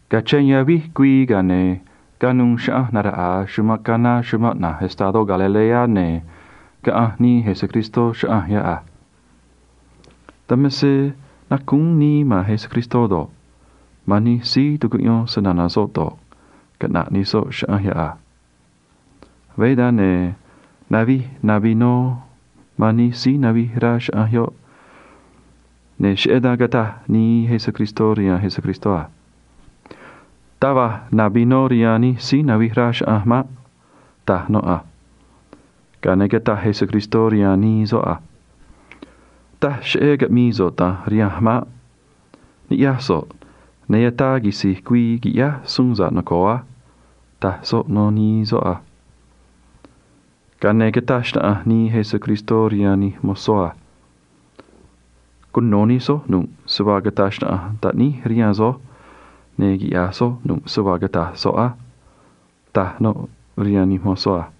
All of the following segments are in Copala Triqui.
Cachén yavíj güii, ga̱a ne̱ canuû chaꞌanj naraꞌa̱a chumanꞌ Caná chumanꞌ na̱j estadó Galilea, ne̱ nu̱u̱ nii Jesús chaꞌanj yoꞌ a. Dan me se nacúún nii man Jesús do̱ꞌ, man nij síí tucuꞌyón snana̱ soꞌ do̱ꞌ, caꞌna̱ꞌ nij soꞌ chaꞌanj yoꞌ a. Veé dan, ne̱ navij na vinó rihaan nij síí navij rá chaꞌanj yoꞌ, ne̱ cheꞌé dan cataj nii Jesús rihaan Jesús a: ―Taj va̱j na vinó rihaan nij síí navij rá chaꞌanj maꞌ ―taj noꞌ a. Ga̱a ne̱ cataj Jesús rihaan nii soꞌ a: ―Taj cheꞌé caꞌmi̱i̱ so̱ꞌ da̱nj rihanj maꞌ. Ni̱ꞌyaj so̱ꞌ, ne̱ ataa quisi̱j güii qui̱ꞌyáj suun sa̱ꞌ noco̱o á ―taj soꞌ rihaan nii soꞌ a. Ga̱a ne̱ cataj xnaꞌanj nii Jesús rihaan nij mozó a: ―Quiꞌya̱j soj nu̱ꞌ se vaa cata̱j xnaꞌanj soꞌ rihaan soj á ―taj noꞌ rihaan nij mozó a.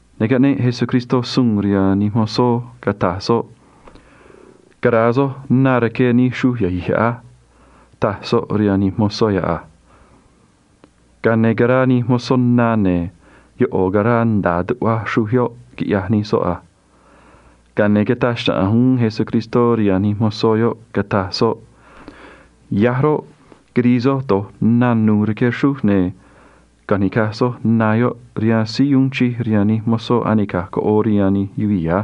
Ne̱ caꞌneꞌ Jesús suun rihaan nij mozó, cataj soꞌ a: ―Cara̱a soj na rque nij xruj yahi̱j yoꞌ á ―taj soꞌ rihaan nij mozó yoꞌ a. Ga̱a ne̱ caraa nij mozó na, ne̱ ꞌo̱ caraa nda̱a tuꞌva xruj yoꞌ, quiꞌyaj nij soꞌ a. Ga̱a ne̱ cataj xnaꞌanj uún Jesús rihaan nij mozó yoꞌ, cataj soꞌ a: ―Ya̱j roꞌ, quiri̱i̱ soj do̱j na nu̱u̱ rque xruj, ne̱ caꞌa̱nj ni̱caj soj na yoꞌ rihaan síí uun chij rihaan nij mozó anica̱j coꞌoo rihaan nij yuvii̱ á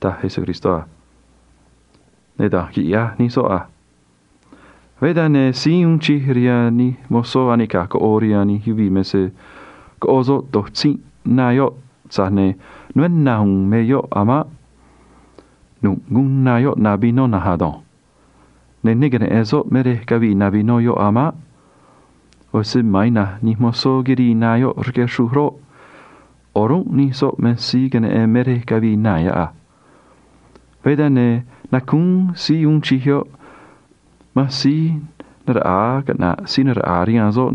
―taj Jesús a. Ne̱ da̱nj quiꞌyaj nij soꞌ a. Veé dan, ne̱ síí uun chij rihaan nij mozó anica̱j coꞌoo rihaan yuvii̱ me se coꞌo soꞌ do̱j tzínꞌ na yoꞌ, tza̱j ne̱ né na̱ u̱u̱n me yoꞌ a̱ maꞌ. Nu̱ꞌ guun na yoꞌ na vinó na̱nj ado̱nj. Ne̱ ne queneꞌe̱n soꞌ me rej cavii na vinó yoꞌ a̱ maꞌ. ꞌO̱ se ma̱an nij mozó quirii na yoꞌ rque xruj roꞌ, o̱rúnꞌ nij soꞌ me síí queneꞌen me rej cavii na yoꞌ a. Veé dan, ne̱ nacúún síí uun chij yoꞌ man síí naraꞌa̱a caꞌna̱ꞌ síí naraꞌa̱a rihaan soꞌ,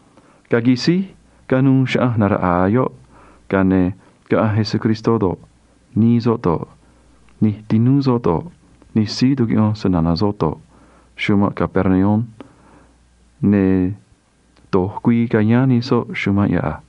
Ga̱a quisíj canuû chaꞌanj naraꞌa̱a yoꞌ, ga̱a ne̱ caꞌanj Jesús do̱ꞌ, nii soꞌ do̱ꞌ, nij tinúú soꞌ do̱ꞌ, nij síí tucuꞌyón snana̱ soꞌ do̱ꞌ, nanij nij soꞌ nda̱a chumanꞌ Capernaum, ne̱ do̱j güii cayáán nij soꞌ chumanꞌ yoꞌ a.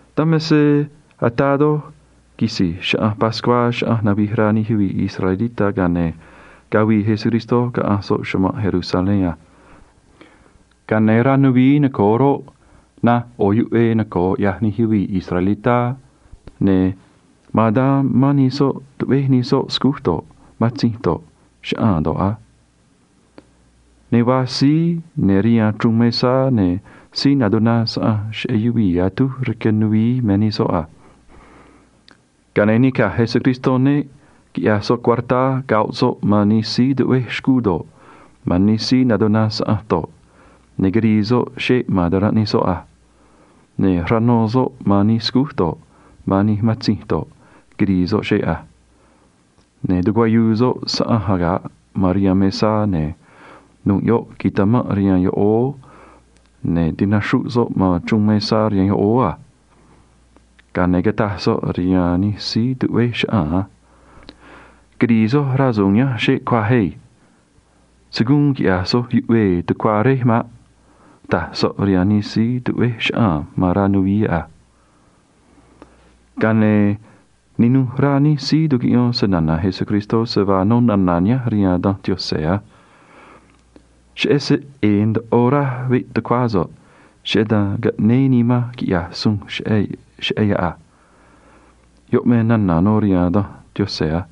Dan me se ataa doj quisi̱j Chaꞌanj Pascuá chaꞌanj navij rá nij yuvii̱ israelitá, ga̱a ne̱ cavii Jesús caꞌanj soꞌ chumanꞌ Jerusalén a. Ga̱a ne̱ rej ya̱nj nuvií noco̱o roꞌ, naj ꞌo̱ yuꞌvee noco̱o ꞌyaj nij yuvii̱ israelitá, ne̱ ma̱an dan mán nij soꞌ tuꞌvéj nij soꞌ scúj do̱ꞌ, matzinj do̱ꞌ, chaꞌaa̱n do̱ꞌ a. Ne̱ vaa síí ya̱nj rihaan chruun mesá, ne̱ síí natuná saꞌanj cheꞌé yuvii̱ atúj rque nuvií me nij soꞌ a. Ga̱a ne̱ nica̱j Jesús neꞌ, quiꞌyaj soꞌ cuartá, ne̱ rno soꞌ man nij síí tuꞌvéj xcuu do̱ꞌ, man nij síí natuná saꞌanj do̱ꞌ, ne̱ quirii soꞌ xeꞌ man ta̱ranꞌ nij soꞌ a. Ne̱ rno soꞌ man nij scúj do̱ꞌ, man nij matzinj do̱ꞌ, quirii soꞌ xeꞌ a. Ne̱ tichaꞌnuu̱ soꞌ se‑saꞌa̱nj síí natuná saꞌanj rihaan yoꞌóó, ne̱ tinaxruꞌ soꞌ nij chruun mesá a. Ga̱a ne̱ cataj soꞌ rihaan nij síí tuꞌvéj chaꞌaa̱n a: ―Quiri̱i̱ soj rasu̱u̱n nihánj xeꞌ cuaj yanj. Se̱ guun quiꞌya̱j soj yuꞌvee tucuá Réj maꞌ ―taj soꞌ rihaan nij síí tuꞌvéj chaꞌaa̱n ma̱n rá nuvií yoꞌ a. Ga̱a ne̱ ninuj rá nij síí tucuꞌyón snana̱ Jesús se vaa nó nana̱ nihánj rihaan Danj Yaꞌanj a: “Cheꞌé se ꞌe̱e̱ ndoꞌo raj veꞌ tucuá so̱ꞌ, cheꞌé dan caꞌnéé nimanj tu̱mé ꞌu̱nj man yoꞌ a.” Yoꞌ me nana̱ nó rihaan Danj Yaꞌanj a.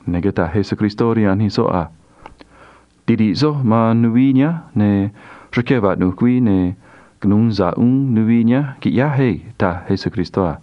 Ne̱ cataj Jesús rihaan nij soꞌ a: ―Tiri̱ꞌ soj man nuvií nihánj, ne̱ rque vaꞌnu̱j güii, ne̱ cunu̱u sa̱ꞌ uún nuvií nihánj, qui̱ꞌyáj chugua̱nj ―taj Jesús a.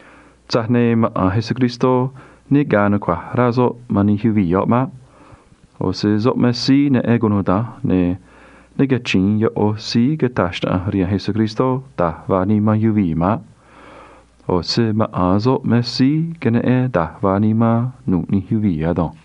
Tza̱j ne̱ maꞌa̱n Jesús me se ne ga̱a̱ nucua̱j rá soꞌ man nij yuvii̱ yoꞌ maꞌ. ꞌO̱ se soꞌ me síí neꞌen cunuda̱nj, ne̱ ne cachi̱in ꞌo̱ síí cata̱j xnaꞌanj rihaan Jesús da̱j vaa nimán yuvii̱ maꞌ. ꞌO̱ se maꞌa̱n soꞌ me síí neꞌen da̱j vaa nimán nu̱ꞌ nij yuvii̱ ado̱nj.